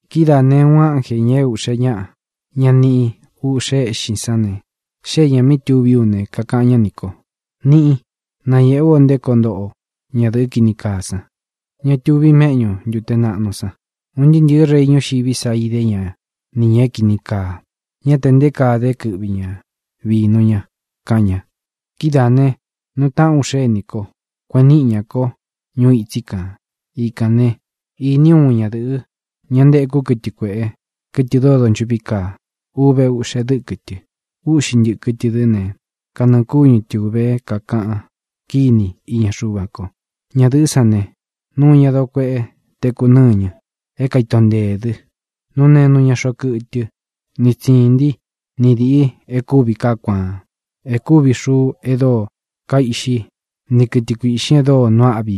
Kidáā ne, uun ánjē, ña é ūꞌxe ñaꞌa, ña níꞌi ūꞌxe éꞌxin sán ne, xée ñā mí tuví u ne, kakaꞌan ñá nī ko: —Niꞌín, nañēꞌe ú o nté koo ntoꞌo ñadɨ̄ꞌɨ́ kini kaa san, ña tuvi méꞌñu ntūte naꞌnu san. Un ntɨꞌɨ̄ rei ñuxiví san idé ña ni ñā é kīni kaa. Ñá te nté kaa dé kɨꞌvi ña vīnu ña —kaꞌan ña. Kidáā né, nuu taꞌán u xénī kó, kueꞌen niꞌi ñá ko ñuu itsí kān. Ikān né, īní u uun ñadɨ̄ꞌɨ, ña ntekú kɨtɨ kuēꞌe, kɨtɨ dóo donchuꞌví kaa. Uve uꞌxe dɨ́kɨ tɨ. Úꞌxi ntɨ̄kɨ tɨ dɨ́ ne, kanɨɨ̄ kúñu tɨ ūve é kākaꞌan kíni iña Xuva ko. Ñadɨ̄ꞌɨ́ san ne, nuu ña doo kuéꞌe teku nɨ́ñɨ, é kaito nteē dɨ. Nuu nenu ña xoꞌo kɨtɨ ni tsīntí ni dīꞌi e kúvi kaá kuaan, e kúvi xuu e dóo kaiꞌxi ni kɨtɨ kuīꞌxin e dóo nuu áꞌvi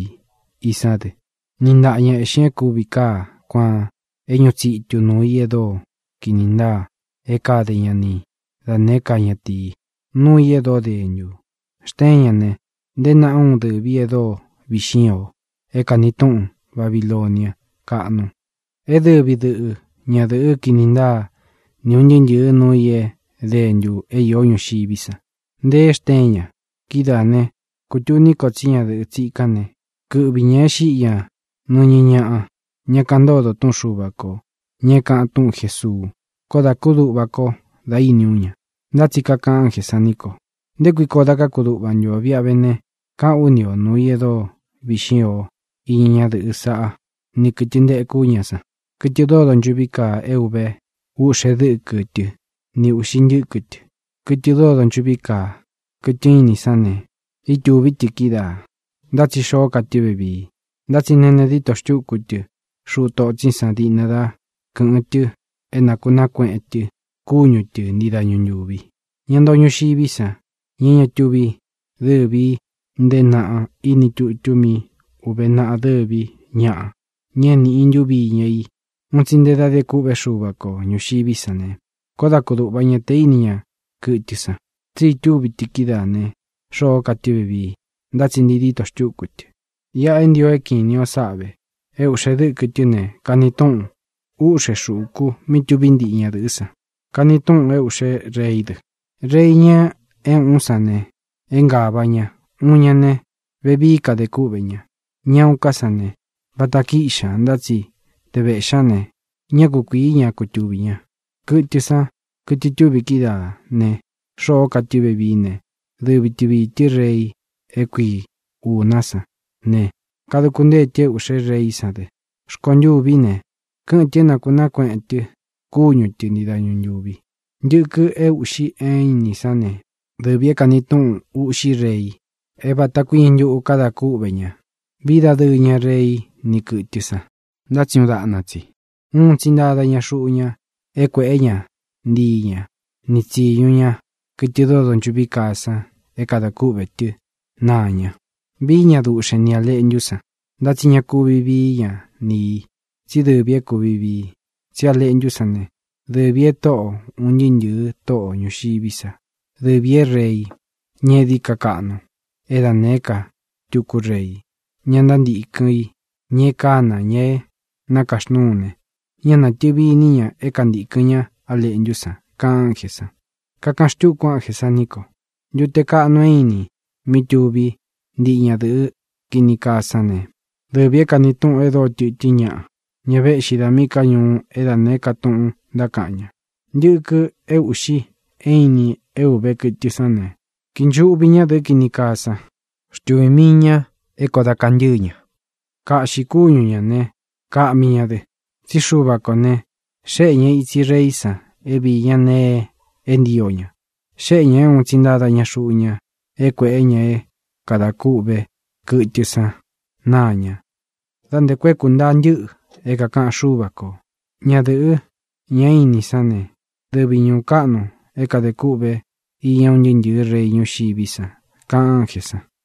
i sán dɨ. Niꞌi ntaꞌa ña eꞌxin e kúvi kaá kuaan é ñuꞌu tsitu nuū í e dóo kini ntáa é kade ña ni da nēé ka ñatīi, nuu i e dóo dentu. Xteén ña ne, nteé naꞌa úun dɨ̄ví e dóo viꞌxín ō, é kāni túꞌun: “Babilonia káꞌnu, é dɨvi dɨꞌɨ ñadɨ̄ꞌɨ́ kini ntáa ni ūn ntɨɨ́ ntɨ̄ɨ́ nuu i é dentu é īó ñuxiví san”, nteé xteen ña. Kidáā né, kūtuní ko tsí ñadɨ̄ꞌɨ tsikán ne, kɨ́ꞌvi ñā e xíꞌi ñā nɨñɨ ñáꞌa, ña kaꞌan ntódo túꞌun Xuva kō, ña é kāꞌan túꞌun Jēsuu. Kóo dā kúduꞌva ko dá īni ú ña. Ntá tsi kakaꞌan ánjē san ní ko: —¿Nté kui koo da kákuduꞌva ntu o? Viꞌa ve ne, kaꞌán u ni ō nuu i e dóo viꞌxín ō iña ñádɨ̄ꞌɨ saꞌá ni kɨ̄tɨ ntekú ña san, kɨtɨ dóo donchuꞌví kaa é uve uꞌxe dɨ́kɨ tɨ́ ni ūꞌxi ntɨ́kɨ tɨ. Kɨtɨ dóo donchuꞌví kaa, kɨtɨ ínin sán ne, ítūví tɨ kídaā, ntá tsi xoó ka tɨ́ vevii. Ntá tsi nene díto xtúku tɨ xuꞌu totsín san diꞌna dá kɨ̄ꞌɨn tɨ é nakūnaá kueꞌen tɨ kúñu tɨ ntii dañu ntūvi. Ña ntoo ñuxiví san, ña é ña túvi dɨ́vi ī nteé naꞌa iní tutu mí ūve naꞌa dɨví ñaꞌa, ña é niꞌi i ntuvi iña i un tsi nte dá de kûꞌvé Xuva ko ñūxiví san ne, kóo da kudūꞌva ña te íni ña kɨtɨ san, tsí itúvi tɨ kídaā ne, xoó ka tɨ́ vevii, ntá tsi ntii dítō xtúku tɨ. ʼIꞌa é ntio é kiꞌin ini ō sáꞌa vē: É ūꞌxe dɨ́kɨ tɨ́ ne, kani túꞌun ūꞌxe xúku mí tuví ntiꞌi ñadɨ̄ꞌɨ́ san. Kani túꞌūn é ūꞌxé reí dɨ. Rei, ña é ūꞌún san ne, é ngāva ña. Uun ña ne, vevií kadē kúꞌvē ña. Ña uun ká san ne, vata kíꞌxi ñā. Ntá tsi te vēꞌxí ña ne, ñá kukuīí ña kutuvi ña. Kɨtɨ san, kɨtɨ itúvi kídaā ne, xoó ka tɨ́ vevií ne, dɨvi tɨ viī tɨ́ rei é kui ūná san ne, kaduku ntée tɨ é ūꞌxé reí san dɨ. Rkontûví ne, kɨ́ꞌɨn tɨ̄ é nākunaá kueꞌen tɨ kúñu tɨ ntii dañu ntūvi. ʼNtɨkɨ é ūꞌxi é inin sán ne, dɨvī é kani túꞌun ūꞌxí rei, é vāta kuíñɨ ntuꞌu kada kúꞌvē ña. Vií dadɨɨ ña rei ni kɨtɨ́ san, ntá tsi uun daꞌna tsi. Un tsi ntáda ña xuꞌu ña é kuēꞌé ña ntii ña ni tsīñu ña kɨtɨ dóo donchuꞌví kaa san é kadā kúꞌvē tɨ́ naa ña. Vií ña duꞌxen ni Ā Leꞌntú san, ntá tsi ña kuvi vií ña ni ī, tsí dɨvī é kūvi vii. Tsí A Leꞌntú san ne, dɨvī e Tóꞌo ūn ntɨɨ́ ntɨ̄ɨ tóꞌo ñūxiví sa, dɨvī é Rei, ña é dií ka kaꞌnu é da nēé ka tuku rei. Ña ntántīkɨn i, ña é kana, ña é nakaxnúu ne, ñá natɨ̄vi iní ña é kuntīkɨn ñá A Leꞌntú san —kaꞌan ánjē san. Kakaꞌan xtúku ánjē san ní ko: —Ntute kaꞌnu é inin, mí tuví ntiꞌi ñadɨ̄ꞌɨ́ kini kaa sán ne, dɨvī é kāni túꞌun e dóo tɨtɨ́n ñaꞌa, ña véꞌxi dā míꞌī ká ñuú é da nēé ka tuꞌun ntákaꞌan ña. Ntɨkɨ é ūꞌxi é inin é ūve kɨtɨ sán ne, kinchuꞌvi ñádɨ̄ꞌɨ́ kini kaa san. Xtuvī mii ña é kōo da kantɨ́ɨ ña. Kaꞌxi kúñu ñā ne, kaꞌmi ña dɨ. Tsí Xuva kō ne, xéꞌe ña ītsi reí san é viī ñá nēe é ntio ña. Xéꞌe ñā é un tsi ntáda ña xuꞌu ña é kuēꞌé ña é kadā kûꞌvé kɨtɨ san náa ñā da nté ku é kūntaa ntɨ́ꞌɨ é kākaꞌan Xúva kō. Ñadɨ̄ꞌɨ́, ña é inin sán ne, dɨvi ñūú kaꞌnu é kadē kûꞌvé iña un ntɨɨ́ ntɨ̄ɨ́ rei ñuxiví san —kaꞌan ánjē san.